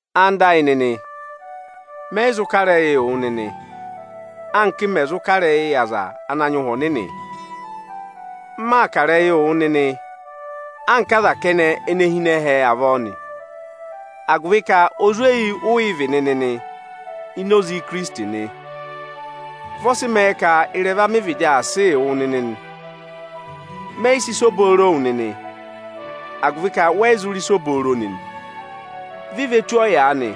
Ẹwụ nịnị ẹyịnyara amị, mẹyị zụ kà ịrẹyịị wụ nịnị, anka m mẹ̀ zụ kà ịrẹyị yị aza ana nyị Ụhwẹ Ọnịnị. Máa kà ịrẹyịị wụ nịnị anka aza kẹnẹ ene hi ịnị ẹhẹ avọọ nị, agụvị ka ozweyi ụ yị vị nịnị ini Ikirisiti nị. Vị ọ sị mẹẹ ka ịrẹva mị vịdị aa sịị wụ nịnị nị. Mẹ yị sị ịsa obooro wụ nịnị, agụvị ka wẹẹ̀ yị zụ rị ịsa obooro nịnị. Vi ve tù ọyaanị,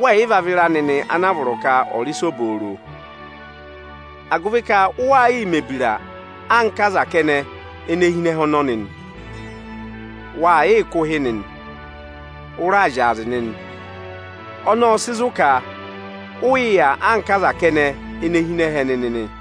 wẹẹ̀ yị va vịra nịnị ana a vọrọ ka ọ̀ọ rị ịsa obooro, agụvị ka ụ waa yịị mẹ̀ ebira anka aza kẹnẹ ene hi ịnị ẹhẹ ọnọnị nị. Waa yịị kụ̀ ụhị nịnị, ụ raa zyaazị nịnị. Ọnọọ ọ́ọ sị zụ̀ ka vụ ụ yị yà anka aza kẹnẹ ene hi ịnị ẹhẹ nịnị nị.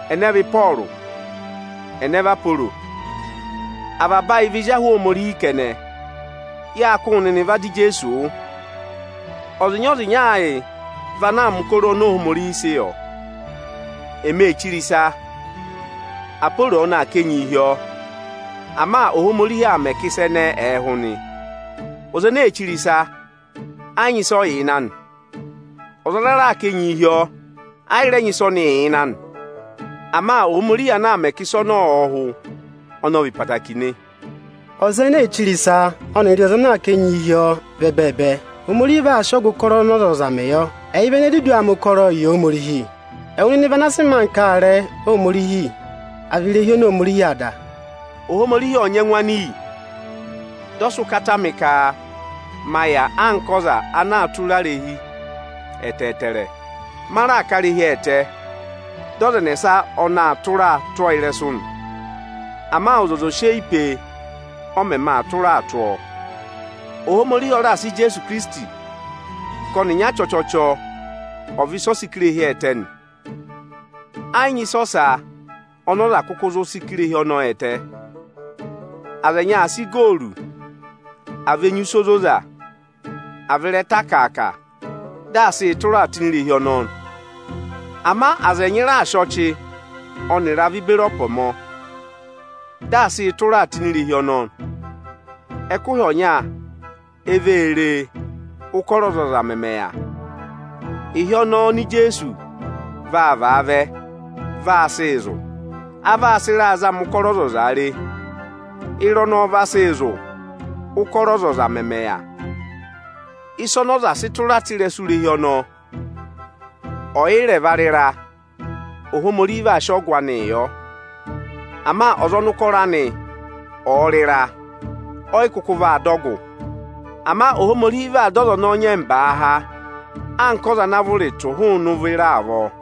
Ẹnẹ vị Ịpọọrụ? Ẹnẹ vị Aporo? Avaba ayị vị ezi ahụ Ohomorihi kẹnẹ. Yáa kụ́ wụ nịnị va dọ Ijeesu wụ́. Ọzịnya-ọzịnya ayị vị ana aa mẹ̀ ụkọrọ oni Ohomorihi sị yọ. Ẹmị ee chire ịsa, Aporo ọnị aa ká enyi hi ọọ, ama Ohomorihi aa mẹ ka ịsa ẹnẹẹ ẹ̀ẹ hụ nị. Ọza ene ee chire ịsa, ẹ yị nyị ịsị ọ yà ịnị anị; ọza ana raa ká enyi hi ọọ, ayị rẹ nyị ịsị ọnị yà ịnị anị. Ama Ohomorihi ana aa mẹ ka ịsa ọnọọ ọ̀ọ hụ, ọnị ọ vị ẹtẹẹtẹrẹ nị. Ọza ene ee chire ịsa, ọnịrị ọza ana aa ká enyi hi ọọ vị ẹbẹẹbẹ. Ohomorihi vaa sị ọgụ ụkọrọ ọnị ọzọza mẹẹ yọ. Ẹyị vị ene dudu aa mẹ ụkọrọọ yị Ohomorihi. Ẹwụ nịnị vị ana sị mẹẹ anka aarẹ Ohomorihi, à vị irehi oni Ohomorihi aa dà. Ohomorihi ọ́ọ nyị ẹngụ anị iyi, dị ọ sị ụkata mị ka ma yà anka ọza ana zụ tụra irehi ẹtẹẹtẹrẹ. Ma raà ká irehi ẹtẹ, dị ọza ẹnẹsa ọnị aa tụraa tụ́ ọọ ịrẹsụ nị. Ama ọzọza ò sị eyi pee, ọ mẹmẹ aa tụraa tụ́ ọọ! Ohomorihi ọ raà sị Ijeesu Ikirisiti ka ọnịnya chọchọchọ ọ̀ vị ịsị ọ sị ká irehi ẹtẹ nị. Ẹ yị nyị ịsa ọsa ọnị ọza kụkụ zụ sị ká irehi ọnọọ ẹtẹ. Aza ẹnyị aa sị igooru, àa vị enyusẹ ozoza, àa vị ịrẹta akàaka, dị aa sịị tụra tụ́ ini irehi ọnọọ. Ama aza ẹnyị raa sị ọchị ọnịrị avị beri ẹpọmọ, dị aa sịị tụraa tụ́ ini irehi ọnọọ. Ẹkụhị ọnya, e vee re, ụ́kọrọ ọzọza mẹmẹ yà. Ịhị ọnọọ oni Ijeesu vaa vaa vẹ, vaa sịị zụ̀. A vaa sị ịraa zama ụkọrọ ọzọza re. Ịra ọnọọ vaa sị zụ̀, ụ́kọrọ ọzọza mẹmẹ yà. Ịsa ọnị ọza sị tụra tụ́ ịrẹsụ irehi ọnọọ ọ̀yị rẹ̀ vaa rị ịra, Ohomorihi vaa sị ọgụ anịị yọ. Ama ọza ọnị ụkọrọ anị ọ̀ọ rị ịra, ọyị kụkụ vaa dọ ọgụ. Ama Ohomorihi vaa dọ ọza ọnọọ ịnyẹmbaa há anka ọza ana vụrị tụ̀ hụụnị ụvọ ịra avọọ.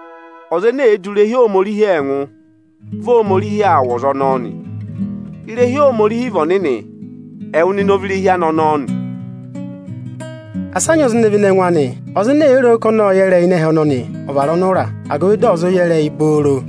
Ọza ene èe du irehi Ohomorihi ẹngụ, vị Ohomorihi aa wụ̀ ọza ọnọọ nị. Irehi Ohomorihi vị ọnịnị, ẹwụ nịnị ọ vị irehi anị ọnọọ nị. Asị a nyị ọza ene vene ẹngụ anị! Ọza ene èe ro ka ọnị ọ́ọ yẹ ịrẹyị ịnị ẹhẹ ọnọnị, ọ̀ vara ọnụra, agụvị dị ọ̀ zụ yẹ ịrẹyị booro!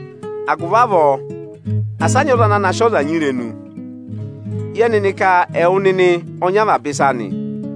Agụvị avọọ, asị a nyị ọza ana na sị ọza nyị irenu! Yẹ nịnị ka ẹwụ nịnị ọ nyị avaba ịsa nị,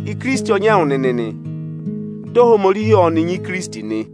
Ikirisiti ọ nyị ẹwụ nịnị, dị Ohomorihi ọnị nyị Ikirisiti nị.